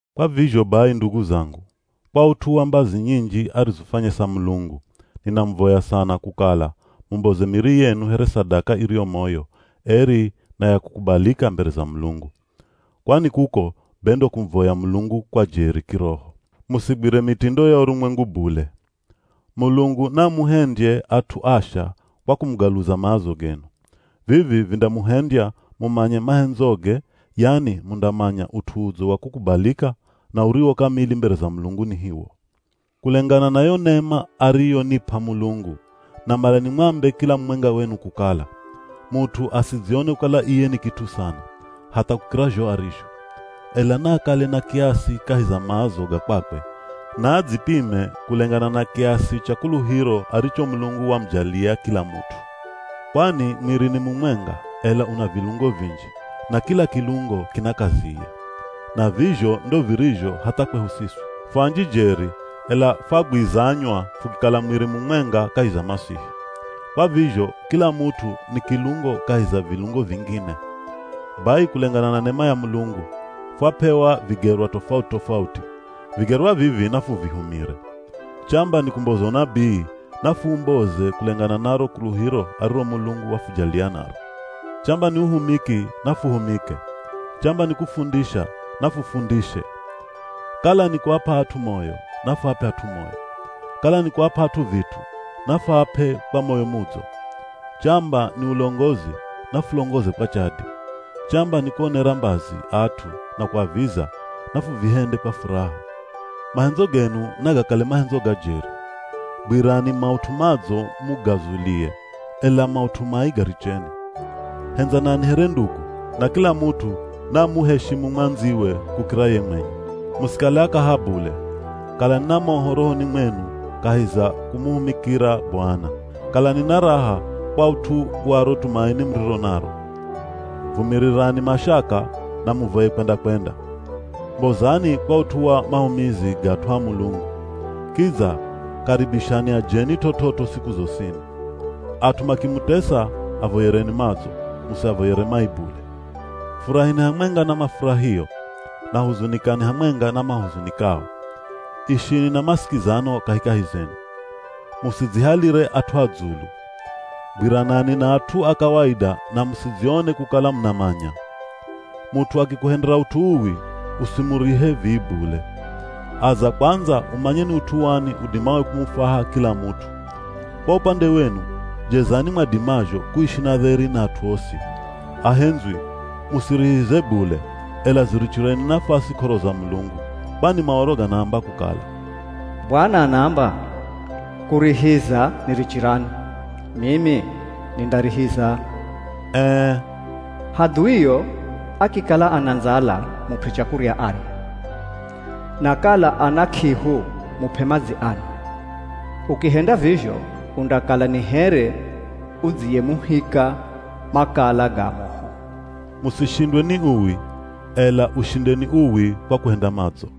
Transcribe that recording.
Kwa vizho bai ndugu zangu, kwa ut'u wa mbazi nyinji arizofwanyesa Mulungu, ninamuvoya sana kukala mumboze miri yenu here sadaka iriyo moyo, eri, na ya kukubalika mbere za Mulungu. Kwani kuko be ndo kumuvoya Mulungu kwa jeri kiroho. Musigwire mitindo ya urumwengu bule. Mulungu naamuhendye at'u asha kwa kumugaluza maazo genu. Vivi vindamuhendya mumanye mahendzoge, yani mundamanya ut'u udzo wa kukubalika, na uriwo kamili mbere za Mulungu ni hiwo. Kulengana na yo nema ariyonip'a Mulungu, namala nimwambe kila mumwenga wenu kukala: Mut'u asidzione kukala iye ni kit'u sana, hatha kukira zho arizho. Ela naakale na kiasi kahi za maazo ga kwakwe, na adzipime kulengana na kiasi cha kuluhiro aricho Mulungu wamujalia kila mut'u. Kwani mwiri ni mumwenga, ela una vilungo vinji, na kila kilungo kina kaziye. Na vizho ndo virizho hatha kwehu siswi. Fu anji jeri ela fwagwizanywa fukikala mwiri mumwenga kahi za Masihi. Kwa vizho kila mut'u ni kilungo kahi za vilungo vingine. Bai kulengana na nema ya Mulungu, fwap'ewa vigerwa tofauti-tofauti. Vigerwa vivi nafuvihumire. Chamba ni kumboza unabii, nafuumboze kulengana na ro kuluhiro ariro Mulungu wafujalia naro. Chamba ni uhumiki, nafuhumike. Chamba ni kufundisha, nafufundishe. Kala ni kuap'a at'u moyo, nafuap'e at'u moyo. Kala ni kuap'a at'u vit'u, nafuap'e kwa moyo mudzo. Chamba ni ulongozi, nafulongoze kwa chadi. Chamba ni kuonera mbazi at'u na kuaviza, nafuvihende kwa furaha. Mahendzo genu nagakale mahendzo ga jeri. Gwirani maut'u madzo mugazulie, ela maut'u mai garicheni. Hendzanani here ndugu, na kila mut'u naamuheshimu mwandziwe kukira ye mwenye. Musikale akaha bule, kalani na moho rohoni mwenu kahi za kumuhumikira Bwana. Kalani na raha kwa ut'u wa ro tumaini muriro naro. Vumirirani mashaka, na muvoye kwenda-kwenda. Mbozani kwa ut'u wa mahumizi ga at'u a Mulungu. Kidza karibishani ajeni t'ot'ot'o siku zosini. At'u makimutesa, avoyereni madzo, musiavoyere mai bule. Furahini hamwenga na mafurahio, na huzunikani hamwenga na mahuzunikao. Ishini na masikizano kahikahi zenu. Musidzihalire at'u a dzulu. Gwiranani na at'u a kawaida na musidzione kukala munamanya. Mut'u akikuhendera ut'u uwi, usimurihe vii bule. Aza kwandza umanye ni ut'u wani udimao kumufwaha kila mut'u. Kwa upande wenu, jezani mwadimazho kuishi na dheri na at'u osi. Ahendzwi, musirihize bule, ela zirichireni nafasi k'oro za Mulungu. Kwani Maoro ganaamba kukala, “Bwana anaamba, kurihiza nirichirani, mimi nindarihiza.” Ee, “Hadhuio akikala ana ndzala mup'e chakurya arye, na kala ana k'ihu mup'e madzi anwe. Ukihenda vizho undakala ni here udziyemuhika makala ga moho.” Musishindwe ni uwi, ela ushindeni uwi kwa kuhenda madzo.